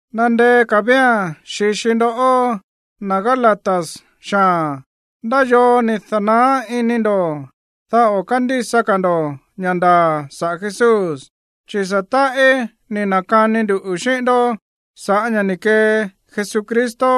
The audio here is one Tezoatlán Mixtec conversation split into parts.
Nandeé ka̱ vía̱n xi̱xi ndoꞌó, na̱ Gálatas xaa̱n. ¿Ndá yoo ni̱ da̱naá iní ndo̱, dá o̱ kándísa ka̱ ndo̱ ña̱ ndaa̱ saꞌa̱ Jesús? Chi̱ sa̱ táꞌí ni̱ na̱kani nduꞌu̱ xíꞌín ndó sa̱ꞌá ña̱ ni̱ kee Jesucristo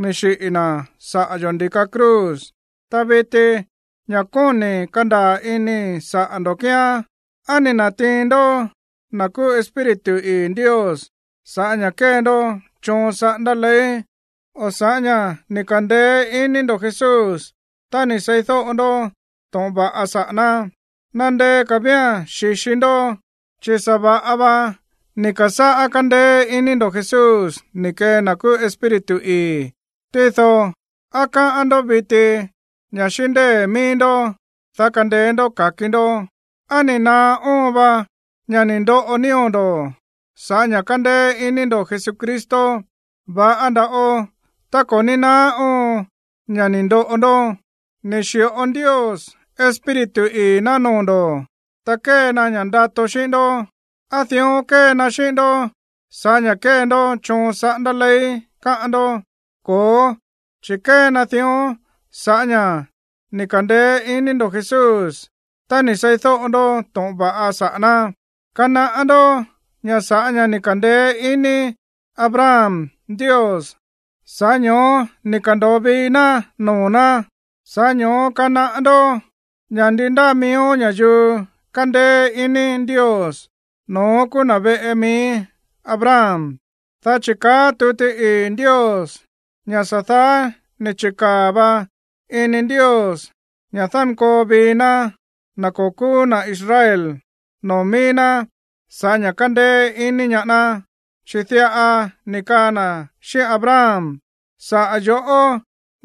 ni̱ xiꞌi̱ na̱ saꞌa̱ yo̱ ndi̱ka cruz. Ta viti, ña̱ kóni̱ kandaa̱ inii̱ saꞌa̱ ndo̱ kíán, ¿á ni̱ na̱tiin ndó na̱ kúú Espíritu ii̱ Ndios sa̱ꞌá ña̱ kée ndó choon saꞌándá ley o sa̱ꞌá ña̱ ni̱ ka̱ndeé iní ndo̱ Jesús tá ni̱ seídóꞌo ndó to̱ꞌon va̱ꞌa saꞌa̱ ná? Nandeé ka̱ vía̱n xi̱xi ndó. Chi̱ sa̱ va̱ꞌa va ni̱ ka̱sáꞌá kándéé iní ndo̱ Jesús ni̱ kee na̱ kúú Espíritu ii̱. Tído, ¿á káꞌán ndó viti ña̱ xíꞌín ndée̱ míí ndó, dá kandeé ndó ka̱ki ndó? ¿Á ni̱ naá óon va ña̱ ni̱ ndoꞌo nío̱ ndo̱ sa̱ꞌá ña̱ kándéé iní ndo̱ Jesucristo? Va̱ꞌa nda̱ꞌo tá ko̱ ní naá óon ña̱ ni̱ ndoꞌo ndó. Ni̱ xi̱ꞌo Ndios Espíritu ii̱ ná noo̱ ndo̱, ta kée na ña̱ꞌa ndato xíꞌín ndó. ¿Á dión kée na xíꞌín ndó sa̱ꞌá ña̱ kée ndó choon saꞌándá ley, káꞌán ndó? Ko̱ó, chi̱ kée na dión sa̱ꞌá ña̱ ni̱ ka̱ndeé iní ndo̱ Jesús tá ni̱ seídóꞌo ndó to̱ꞌon va̱ꞌa saꞌa̱ ná. Kanaꞌá ndó ña̱ sa̱ꞌá ña̱ ni̱ ka̱ndeé iní Abraham Ndios, sa̱ꞌá ño̱ó ni̱ ka̱ndo̱o vii ná noo̱ ná. Sa̱ꞌá ño̱ó kanaꞌá ndó ña̱ ndi ndáa miíó ña̱yuu kándéé iní Ndios, no̱ón kúú na̱ veꞌe mií Abraham. Dá chi̱ káꞌa̱n tuti ii̱ Ndios ña̱ sa̱ daá ni̱ chi̱kaa̱ va ini Ndios ña̱ dánkoo vii ná na̱ ko̱ kúú na̱ Israel noo̱ míí ná sa̱ꞌá ña̱ kandeé ini ñaá ná, chi̱ diꞌa ni̱ kaa na̱ xíꞌín Abraham: “Saꞌa̱ yo̱ꞌó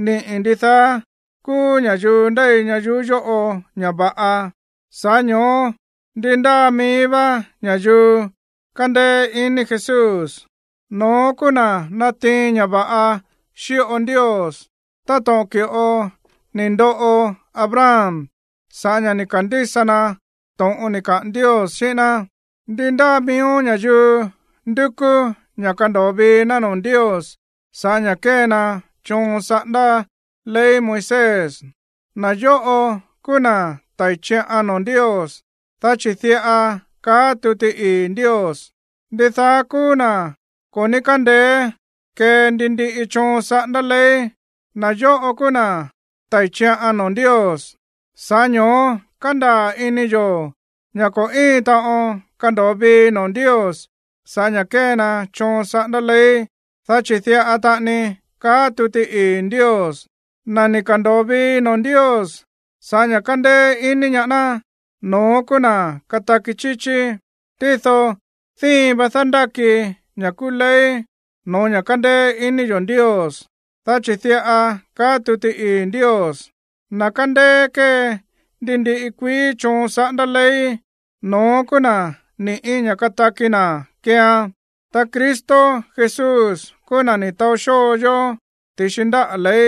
niꞌi̱ ndidaá kúú ña̱yuu ndéi ñayuú yóꞌo ña̱ va̱ꞌa.” Sa̱ꞌá ño̱ó ndi ndáa mií vá ña̱yuu kándéé ini Jesús, no̱ón kúú na̱ natiin ña̱ va̱ꞌa xíꞌo Ndios, táto̱ꞌon ki̱ꞌo ni̱ ndoꞌo Abraham sa̱ꞌá ña̱ ni̱ ka̱ndísa na to̱ꞌon ni̱ kaꞌa̱n Ndios xíꞌín ná. Ndi ndáa miíó ña̱yuu ndúkú ña̱ kando̱o vii ná noo̱ Ndios sa̱ꞌá ña̱ kée na choon saꞌándá ley Moisés, na̱ yóꞌo kúú na̱ tái̱ chiꞌan noo̱ Ndios. Dá chi̱ diꞌa káꞌa̱n tuti ii̱ Ndios: “Ndidaá kúú na̱ ko̱ ní kándeé kee ndi ndiꞌi choon saꞌándá ley, na̱ yóꞌo kúú na̱ tái̱ chiꞌan noo̱ Ndios.” Sa̱ꞌá ño̱ó kándaa̱ ini yo̱ ña̱ ko̱ íin taꞌon kando̱o vii noo̱ Ndios sa̱ꞌá ña̱ kée na choon saꞌándá ley. Dá chi̱ diꞌa taꞌani káꞌa̱n tuti ii̱ Ndios: “Na̱ ni̱ ka̱ndo̱o vii noo̱ Ndios sa̱ꞌá ña̱ kándéé ini ñaá ná, no̱ón kúú na̱ kataki chíchí.” Tído díin va dándáki ña̱ kúú ley no̱ó ña̱ kándéé iní yo̱ Ndios, dá chi̱ diꞌa káꞌa̱n tuti ii̱ Ndios: “Na̱ kándéé kée ndi ndiꞌi kuií choon saꞌándá ley, no̱ón kúú na̱ ni̱ꞌí ña̱ kataki na̱ keean.” Ta Cristo Jesús kúú na̱ ni̱ taó xóo yó ti̱xi ndáꞌa̱ ley,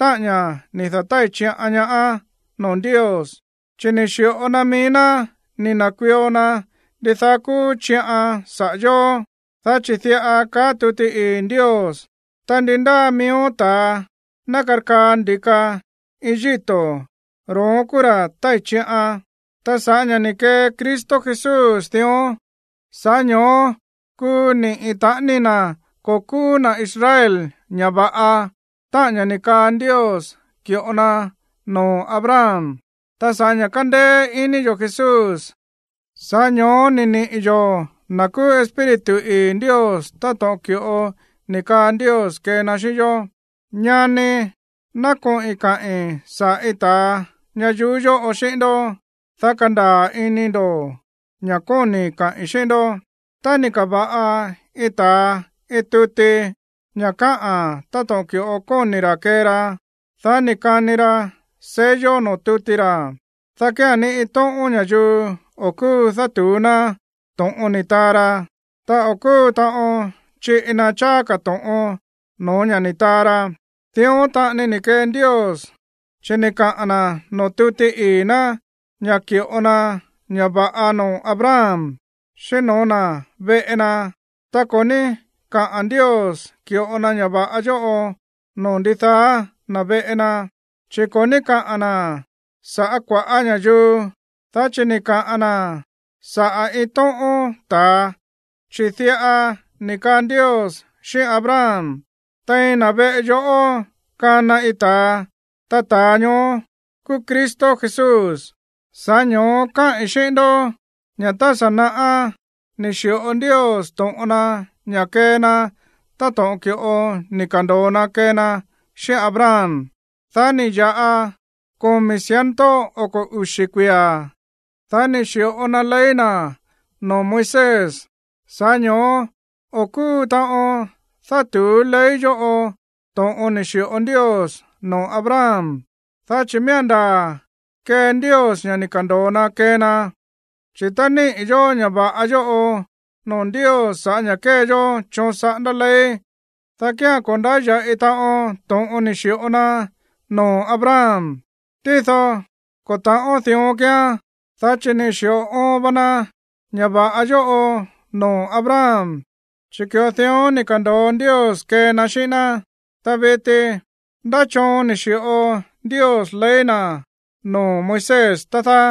táꞌa̱n ña̱ ni̱ da̱tái̱ chiꞌan ñaá noo̱ Ndios. Chi̱ ni̱ xi̱ꞌo na mií ná ni̱ na̱kuio na ndidaá kúú chiꞌan saꞌa̱ yo̱, dá chi̱ diꞌa kaá tuti ii̱ Ndios: “Ta ndi ndáa miíó ta̱a ná karkaa ndi̱ka iin yíto̱, ro̱ón kúú ra̱ tái̱ chiꞌan.” Ta sa̱ꞌá ña̱ ni̱ kee Cristo Jesús dión, sa̱ꞌá ño̱ó kuu niꞌi̱ taꞌani na̱ ko̱ kúú na̱ Israel ña̱ va̱ꞌa, táꞌa̱n ña̱ ni̱ kaa Ndios ki̱ꞌo na noo̱ Abraham. Ta sa̱ꞌá ña̱ kándéé iní yo̱ Jesús, sa̱ꞌá ño̱ó ni̱ niꞌi̱ yo̱ na̱ kúú Espíritu ii̱ Ndios táto̱ꞌon ki̱ꞌo ni̱ kaa Ndios kee na xíꞌín yó. Ñanii̱, ná koꞌi̱n kaꞌi̱n saꞌa̱ iin ta̱a ñayuú yóꞌo xíꞌín ndó, dá kandaa̱ ini ndo̱ ña̱ kóni̱i̱ kaꞌi̱n xíꞌín ndó. Tá ni̱ ka̱va̱ꞌa iin ta̱a iin tuti ña̱ káꞌa̱n táto̱ꞌon ki̱ꞌo kóni̱ ra̱ kee ra, dá ni̱ kani ra sello noo̱ tuti ra̱, dá kía̱n ni iin tóꞌón ña̱yuu o̱ kúu dátu̱ú ná to̱ꞌon ni̱ taa ra, ta o̱ kúu taꞌon chiꞌi na cháá ka̱ to̱ꞌon no̱ó ña̱ ni̱ taa ra. Dión taꞌani ni̱ kee Ndios, chi̱ ni̱ kaa na̱ noo̱ tuti ii̱ ná ña̱ ki̱ꞌo na ña̱ va̱ꞌa noo̱ Abraham, xíꞌín no̱ó na̱ veꞌe na. Ta ko̱ ní kaꞌa̱n Ndios ki̱ꞌo na ña̱ va̱ꞌa yóꞌo noo̱ “ndidaá na̱ veꞌe na”, chi̱ ko̱ ní kaꞌa̱n na̱ sa̱ꞌá kua̱ꞌá ña̱yuu, dá chi̱ ni̱ kaꞌa̱n na̱ saꞌa̱ iin tóꞌón ta̱a, chi̱ diꞌa ni̱ kaa Ndios xíꞌín Abraham: “Tein na̱ veꞌe yoꞌó kana iin ta̱a.” Ta ta̱a ñoó kúú Cristo Jesús. Sa̱ꞌá ño̱ó káꞌi̱n xíꞌín ndó ña̱ tá sa̱ naꞌá ni̱ xi̱ꞌo Ndios to̱ꞌon na ña̱ kee na táto̱ꞌon ki̱ꞌo ni̱ ka̱ndo̱o na kee na xíꞌín Abraham. Dá ni̱ ya̱ꞌa komi̱ ciento oko̱ uxi̱ kuia̱, dá ni̱ xi̱ꞌo na ley na̱ noo̱ Moisés. Sa̱ꞌá ño̱ó o̱ kúu taꞌon dátu̱ú ley yóꞌo to̱ꞌon ni̱ xi̱ꞌo Ndios noo̱ Abraham, dá chi̱ miía̱n ndaa̱ kee Ndios ña̱ ni̱ ka̱ndo̱o na kee na. Chi̱ tá niꞌi̱ yo̱ ña̱ va̱ꞌa yóꞌo noo̱ Ndios sa̱ꞌá ña̱ kée yó choon saꞌándá ley, dá kía̱n ko̱ ndáya̱ꞌi taꞌon to̱ꞌon ni̱ xi̱ꞌo na noo̱ Abraham. Tído ko̱ ta̱ꞌón dión kíán, dá chi̱ ni̱ xi̱ꞌo oon va na ña̱ va̱ꞌa yóꞌo noo̱ Abraham, chi̱ ki̱ꞌo dión ni̱ ka̱ndo̱o Ndios kee na xíꞌín ná. Ta viti, ¿ndá choon ni̱ xi̱ꞌo Ndios ley na̱ noo̱ Moisés, tá dáá?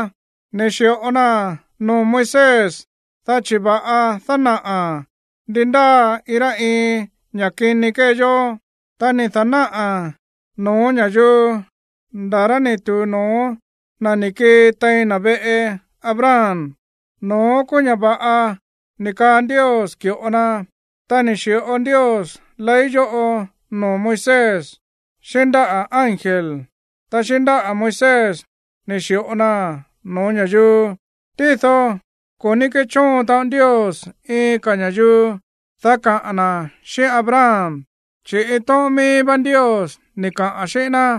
Ni̱ xi̱ꞌo naa̱n noo̱ Moisés dá chi̱ va̱ꞌan dánaꞌa̱a̱n ndi ndáa iin rá iin ña̱ꞌa kini kée yó. Ta ni̱ da̱náꞌa̱a̱n no̱ó ña̱yuu nda̱ rá ni̱ tu̱u no̱ó na̱ ni̱ kii tein na̱ veꞌe Abraham. No̱ón kúú ña̱ va̱ꞌa ni̱ kaa Ndios ki̱ꞌo na. Ta ni̱ xi̱ꞌo Ndios ley yóꞌo noo̱ Moisés xíꞌín ndáꞌa̱ ángel. Ta xíꞌín ndáꞌa̱ Moisés ni̱ xi̱ꞌo naa̱n no̱ó ña̱yuu. Tído ko̱ ní kéchóon taꞌon Ndios iin ka̱ ña̱yuu, dá kaꞌa̱n na̱ xíꞌín Abraham, chi̱ iin tóꞌón míí vá Ndios ni̱ kaꞌa̱n xíꞌín ná.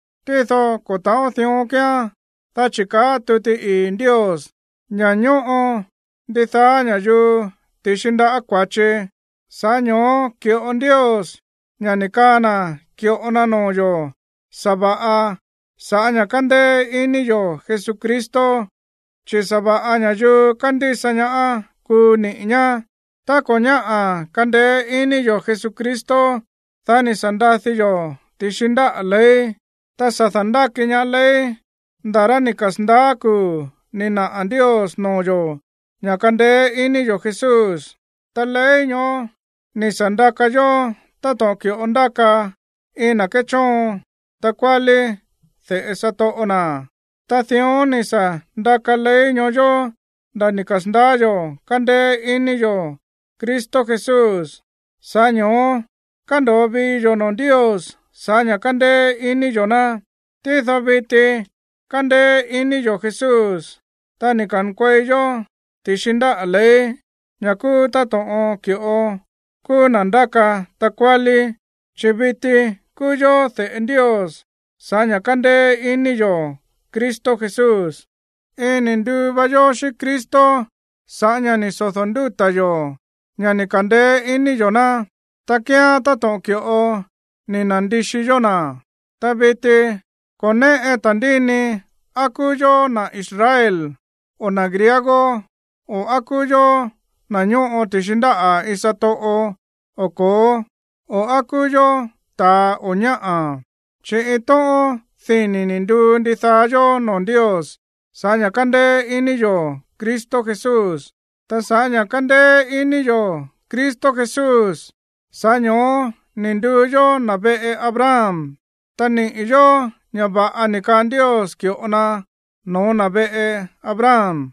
Tído ko̱ ta̱ꞌón dión kíán, dá chi̱ káꞌa̱n tuti ii̱ Ndios ña̱ ñóꞌo ndidaá ña̱yuu ti̱xi ndaꞌá kua̱chi, sa̱ꞌá ño̱ó ki̱ꞌo Ndios ña̱ ni̱ kaꞌa̱n na̱ ki̱ꞌo na noo̱ yo̱ sa̱va̱ꞌa sa̱ꞌá ña̱ kándéé iní yo̱ Jesucristo, chi̱ sa̱va̱ꞌa ña̱yuu kándísa ñaá kuu niꞌi̱ ñá. Tá ko̱ ñáꞌa̱ kandeé iní yo̱ Jesucristo, dá ni̱ sa̱ ndadi yo̱ ti̱xi ndáꞌa̱ ley. Ta sa̱ da̱ndáki ñaá ley nda̱ rá ni̱ kasa̱ndaá kuu̱ ni̱ naꞌa̱ Ndios noo̱ yo̱ ña̱ kandeé iní yo̱ Jesús. Ta ley ñoó ni̱ sa̱ ndakaan yó táto̱ꞌon ki̱ꞌo ndáka iin na̱ kéchóon takuálí de̱ꞌe satoꞌo na̱. Ta dión ni̱ sa̱ ndaka ley ñoó yó nda̱ ni̱ kasa̱ndaá yo̱ kandeé iní yo̱ Cristo Jesús, sa̱ꞌá ño̱ó kándo̱o vii yo̱ noo̱ Ndios sa̱ꞌá ña̱ kándéé iní yo̱ ná. Tído viti kándéé iní yo̱ Jesús, ta ni̱ ka̱nkuei yó ti̱xi ndáꞌa̱ ley, ña̱ kúú táto̱ꞌon ki̱ꞌo kúú na̱ ndáka takuálí, chi̱ viti kúú yó de̱ꞌe Ndios sa̱ꞌá ña̱ kándéé iní yo̱ Cristo Jesús. Iin ni̱ nduu va yó xíꞌín Cristo sa̱ꞌá ña̱ ni̱ sodo̱ ndúta̱ yo̱ ña̱ ni̱ ka̱ndeé iní yo̱ ná. Tá kíán táto̱ꞌon ki̱ꞌo ni̱ na̱ndixi yó na̱. Ta viti ko̱ néꞌe ta̱ndíni á kúú yó na̱ Israel o na̱ griego, o á kúú yó na̱ ñóꞌo ti̱xi ndáꞌa̱ iin satoꞌo o ko̱ó, o á kúú yó ta̱a o ñáꞌa̱, chi̱ iin tóꞌón dini̱ ni̱ nduu ndidaá yó noo̱ Ndios sa̱ꞌá ña̱ kándéé iní yo̱ Cristo Jesús. Ta sa̱ꞌá ña̱ kándéé iní yo̱ Cristo Jesús, sa̱ꞌá ño̱ó ni̱ nduu yó na̱ veꞌe Abraham, ta niꞌi̱ yo̱ ña̱ va̱ꞌa ni̱ kaa Ndios ki̱ꞌo na no̱ó na̱ veꞌe Abraham.